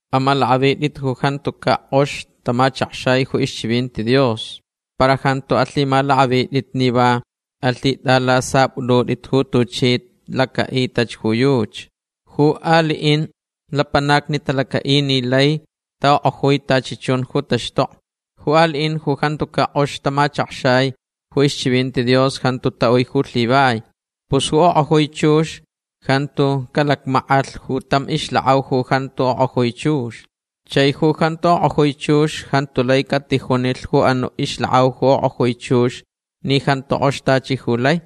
Amalakʼavitʼit ju jantucaʼ kʼox tamachakxai ju ixchivinti Dios. Para jantu alhimalakʼavitʼit ni va alhitʼalasapʼutʼutʼit ju tuchi lacaʼitach ju yuchi. Ju aliʼin lapanacni talacaʼich ni laich taʼokʼojui tachi chun ju taxtokni. Ju aliʼin ju jantucaʼ kʼox tamachakxai ju ixchivinti Dios jantu taʼui ju lhivai. Pus ju okʼojui chux jantu calacmackʼalh ju tam ixlakʼau ju jantuch okʼojui chux. Chai ju jantu okʼojui chux jantu lai catijunilh ju anuʼ ixlakʼau ju okʼojui chux ni jantu kʼox tachi ju lai.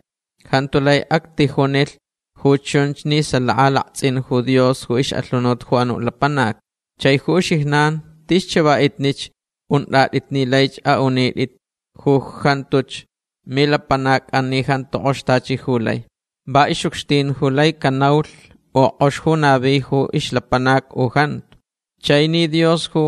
Jantu lai actijunilh ju chunch ni salaka laktsʼin ju Dios ju ixʼalhunut ju anuʼ lapanac. Chai ju uxijnan tis chavaʼitnich untʼatʼit ni laich aʼunitʼit ju jantuch milapanacʼan ni jantu kʼox tachi ju lai. Va ixʼucxtin ju lai canaulh u kʼox ju navi ju ixlapanac u jantu. Chai ni Dios ju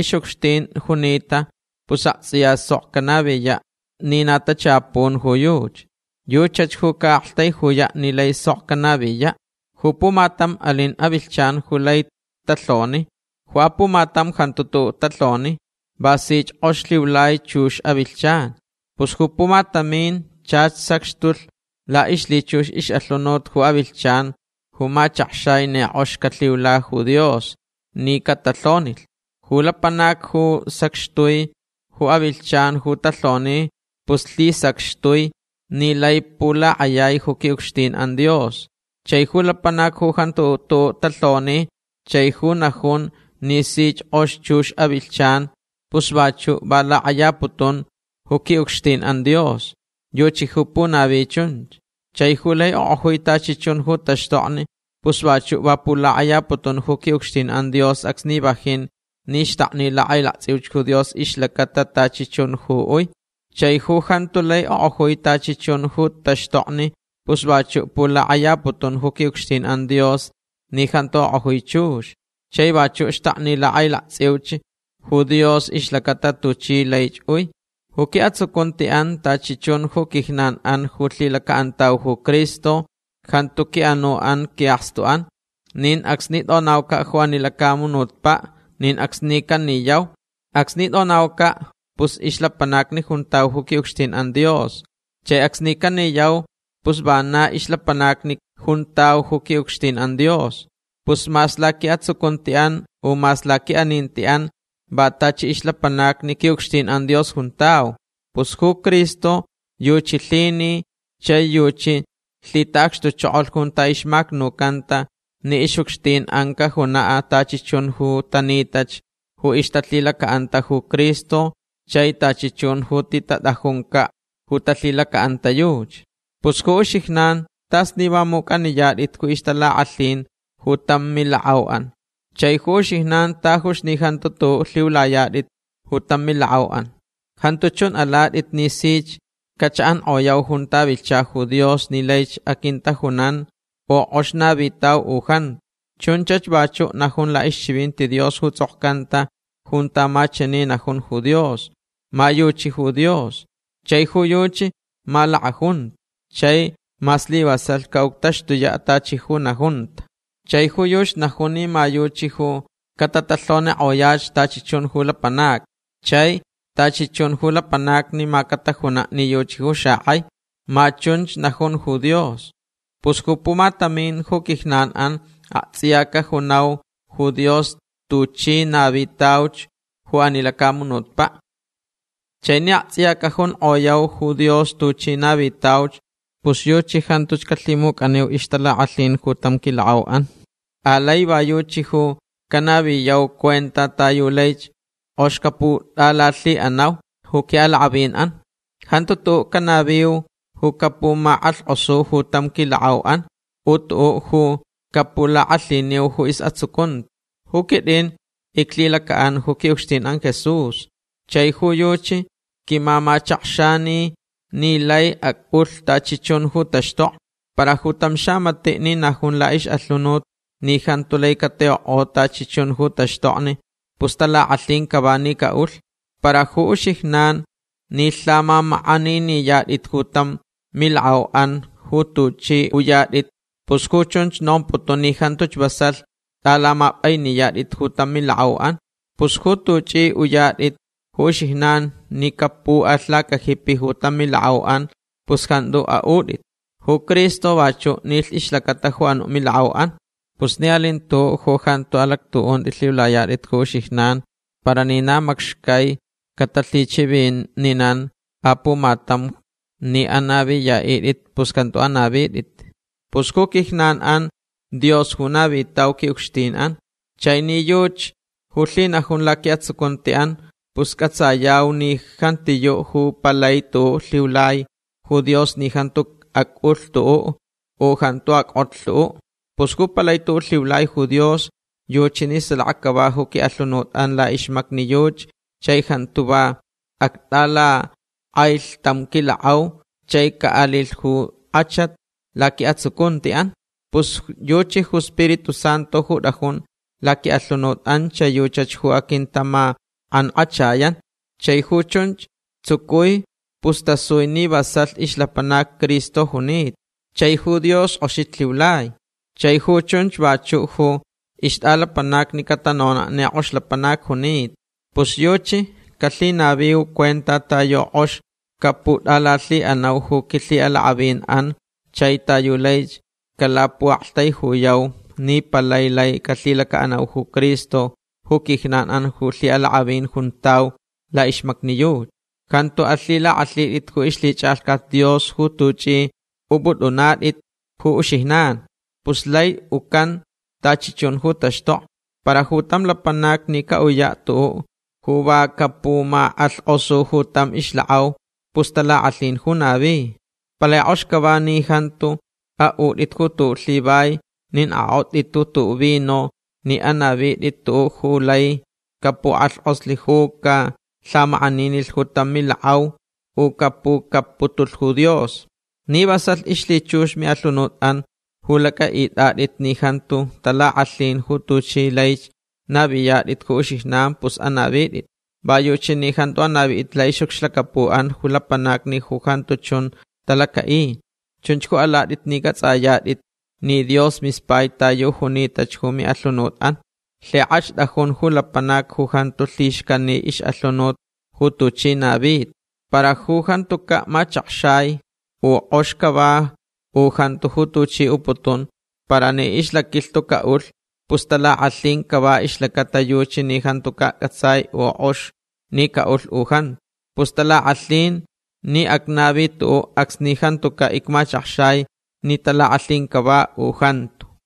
ixʼucxtin junita pus aktsʼiya sok canaviyaʼ ni na tachapun ju yuchi. Yuchach ju caʼaktaijuyaʼ ni lai sok canaviyaʼ. Ju pumatam alin avilhchan ju lai talhoni. Ju apumatam jantu tuʼuʼ talhoni. Va sich kʼox lhiulai chux avilhchan. Pus ju pumatamin chach sacxtulh laʼixlhichux ixʼalhunut ju avilhchan ju machakxai ni kʼox calhiula ju Dios ni catalhonilh. Ju lapanac ju sacxtui ju avilhchan ju talhoni pus lhisacxtui ni lai pulakʼayai ju quiʼucxtinʼan Dios. Chai ju lapanac ju jantu tuʼuʼ talhoni chai va najunch ni sich kʼox chux avilhchan pus vachuʼ va lakʼayaputun ju quiʼucxtinʼan Dios. Yuchi ju punavi chunch. Chai ju lai okʼojui tachi chun ju taxtokni pus vachuʼ va pulakʼayaputun ju quiʼucxtinʼan Dios acsni vajin ni xtakni lakʼailaktsʼiuch ju Dios ixlacata tachi chun ju uich. Chai ju jantu lai okʼojui tachi chun ju taxtokni pus vachuʼ pulakʼayaputun ju quiʼucxtinʼan Dios ni jantu okʼojui chux. Chai vachuʼ xtakni lakʼailaktsʼiuch ju Dios ixlacata tuchi laich ui. Ju quiʼatsucuntiʼan tachi chun ju quijnanʼan ju lhilacaʼantauch ju Cristo jantu quiʼanuʼan quiʼakstuʼan. Nin acsni tʼonaucaʼ ju ani lacamunutpaʼ nin acsni caniyau. Acsni tʼonaucaʼ pus ixlapanacni juntau ju quiʼucxtinʼan Dios. Chai acsni caniyau pus vana ixlapanacni juntau ju quiʼucxtinʼan Dios. Pus mas laquiʼatsucuntiʼan u mas laquiʼanintiʼan va tachi ixlapanacni quiʼucxtinʼan Dios juntau. Pus ju Cristo yuchi lhinilh chai yuchi lhitaʼacxtuchokolh junta ixmacnucanta ni ixʼucxtinʼan cajunaʼ tachi chun ju tanitach ju ixtalhilacaʼanta ju Cristo chai tachi chun ju titatʼajuncaʼ ju talhilacaʼanta yuchi. Pus ju uxijnan tas ni va mucʼaniyatʼit ju ixtalakʼalhin ju tam milakʼauʼan. Chai ju uxijnan tajuch ni jantu tuʼuʼ lhiulayatʼit ju tam milakʼauʼan. Jantu chun alatʼit ni sich cachaʼankʼoyau junta vilhcha ju Dios ni laich aquintajunan u kʼox navitau u jantu. Chunchach vachuʼ najun laʼixchivinti Dios ju tsʼokcanta junta ma chani najun ju Dios: Ma yuchi ju Dios. Chai ju yuchi ma lakʼajunta. Chai ma slivasalh caʼuctaxtuyaʼ tachi ju najunta. Chai ju yuchi najun ni ma yuchi ju catatalhonikʼoyach tachi chun ju lapanacni. Chai tachi chun ju lapanacni ma catajunaʼ ni yuchi ju xakʼaich. Ma chunch ju najun ju Dios. Pus ju pumatamin ju quijnanʼan aktsʼiya cajunau ju Dios tuchi navitauch ju ani lacamunutpaʼ. Chai ni aktsʼiya cajunkʼoyau ju Dios tuchi navitauch pus yuchi jantuch calhimucʼaniu ixtalakʼalhin ju tam quilakʼauʼan. Alai va yuchi ju canaviyau cuenta ta yu laich kʼox caputʼalalhiʼanau ju quiʼalakʼavinʼan. Jantu tuʼuʼ canaviu ju capumakʼalhkʼosu ju tam quilakʼauʼan u tuʼuʼ ju capulakʼalhiniu ju isʼatsucunti. Ju quitʼin iclhilacaʼan ju quiʼucxtinʼan Jesús. Chai ju yuchi quimamachakxanilh ni laich acʼulh tachi chun ju taxtokni. Para ju tam xamatiʼ ni najun laʼixʼalhunut ni jantu lai catiʼokʼo tachi chun ju taxtokni pus talakʼalhin cava ni caʼulh. Para ju uxijnan ni lhamamakʼaniniyatʼit ju tam milakʼauʼan ju tuchʼi uyatʼit pus ju chunch nomputun ni jantuch vasalh tʼalamapʼainiyatʼit ju tam milakʼauʼan. Pus ju tuchʼi uyatʼit ju uxijnan ni capuʼalh lacajipi ju tam milakʼauʼan pus jantu aʼutʼit. Ju Cristo vachuʼ nilh ixlacata ju anuʼ milakʼauʼan. Pus ni alin tuʼuʼ ju jantu alactuʼunti lhiulayatʼit ju uxijnan para ni na macxcai catalhichivininan apumatam ni anaviyaʼitʼit pus jantu anavitʼit. Pus ju quijnanʼan Dios ju navitau quiʼucxtinʼan. Chai ni yuchi ju lhinajun laquiʼatsucuntiʼan pus cʼatsayau ni jantiyuʼ ju palai tuʼuʼ lhiulai ju Dios ni jantu acʼulh tuʼuʼ u jantu ackʼotlh tuʼuʼ. Pus ju palai tuʼuʼ lhiulai ju Dios yuchi ni salaka cava ju quiʼalhunutʼan laʼixmacni yuchi chai jantu va actʼalakʼailh tam quilakʼau chai caʼalilh ju kʼachat laquiʼatsucuntiʼan. Pus yuchi ju Spiritu Santu ju tʼajun laquiʼalhunutʼan chai yuchach ju aquintamakʼankʼachayan. Chai ju chunchach tsucui pus tasui ni vasalh ixlapanac Cristo junita. Chai ju Dios kʼoxich lhiulai. Chai ju chunch vachuʼ ju ixtʼalapanacni catanonaʼ ni kʼox lapanac junita. Pus yuchi calhinaviu cuenta ta yu kʼox caputʼalalhiʼanau ju quilhiʼalakʼavinʼan chai ta yu laich calapuʼaktaijuyau ni palai lai calhilacaʼanau ju Cristo ju quijnanʼan ju lhiʼalakʼavin juntau laʼixmacni yuchi. Jantu alhilakʼalhitʼit ju ixlhichʼalhcat Dios ju tuchʼi upʼutʼunatʼit ju uxijnan. Pus lai ucan tachi chun ju taxtokni. Para ju tam lapanac ni caʼuyaʼ tuʼuʼ ju va capumakʼalhkʼosu ju tam ixlakʼau pus talakʼalhin ju navi. Palai kʼox cava ni jantu aʼutʼit ju tuʼuʼ lhivai nin akʼotʼit ju tuʼuʼ vino nin anavitʼit tuʼuʼ ju laich capukʼalhkʼoslh u calhamakʼaninilh ju tam milakʼau u capucapputulh ju Dios. Ni vasalh ixlhichux miʼalhunutʼan ju lacʼaʼitʼatʼit ni jantu talakʼalhin ju tuchi laich naviyatʼit ju uxijnan pus anavitʼit. Va yuchi ni jantu anavitʼit laʼixʼucxlacapuʼan ju lapanacni ju jantu chun talacaʼi. Chunch ju alatʼit ni cʼatsʼayatʼit ni Dios mispai ta yu junitach ju miʼalhunutʼan. Lhikʼach tʼajun ju lapanac ju jantu lhixcani ixʼalhunut ju tuchi navita. Para ju jantucaʼ machakxai u kʼox cava u jantu ju tuchi uputun para ni ixlaquilhtu caʼulh pus talakʼalhin cava ixlacata yuchi ni jantucaʼ cʼatsai u kʼox ni caʼulh u jantu. Pus talakʼalhin ni acnavi tuʼuʼ acsni jantucaʼ icmachakxai ni talakʼalhin cava u jantu.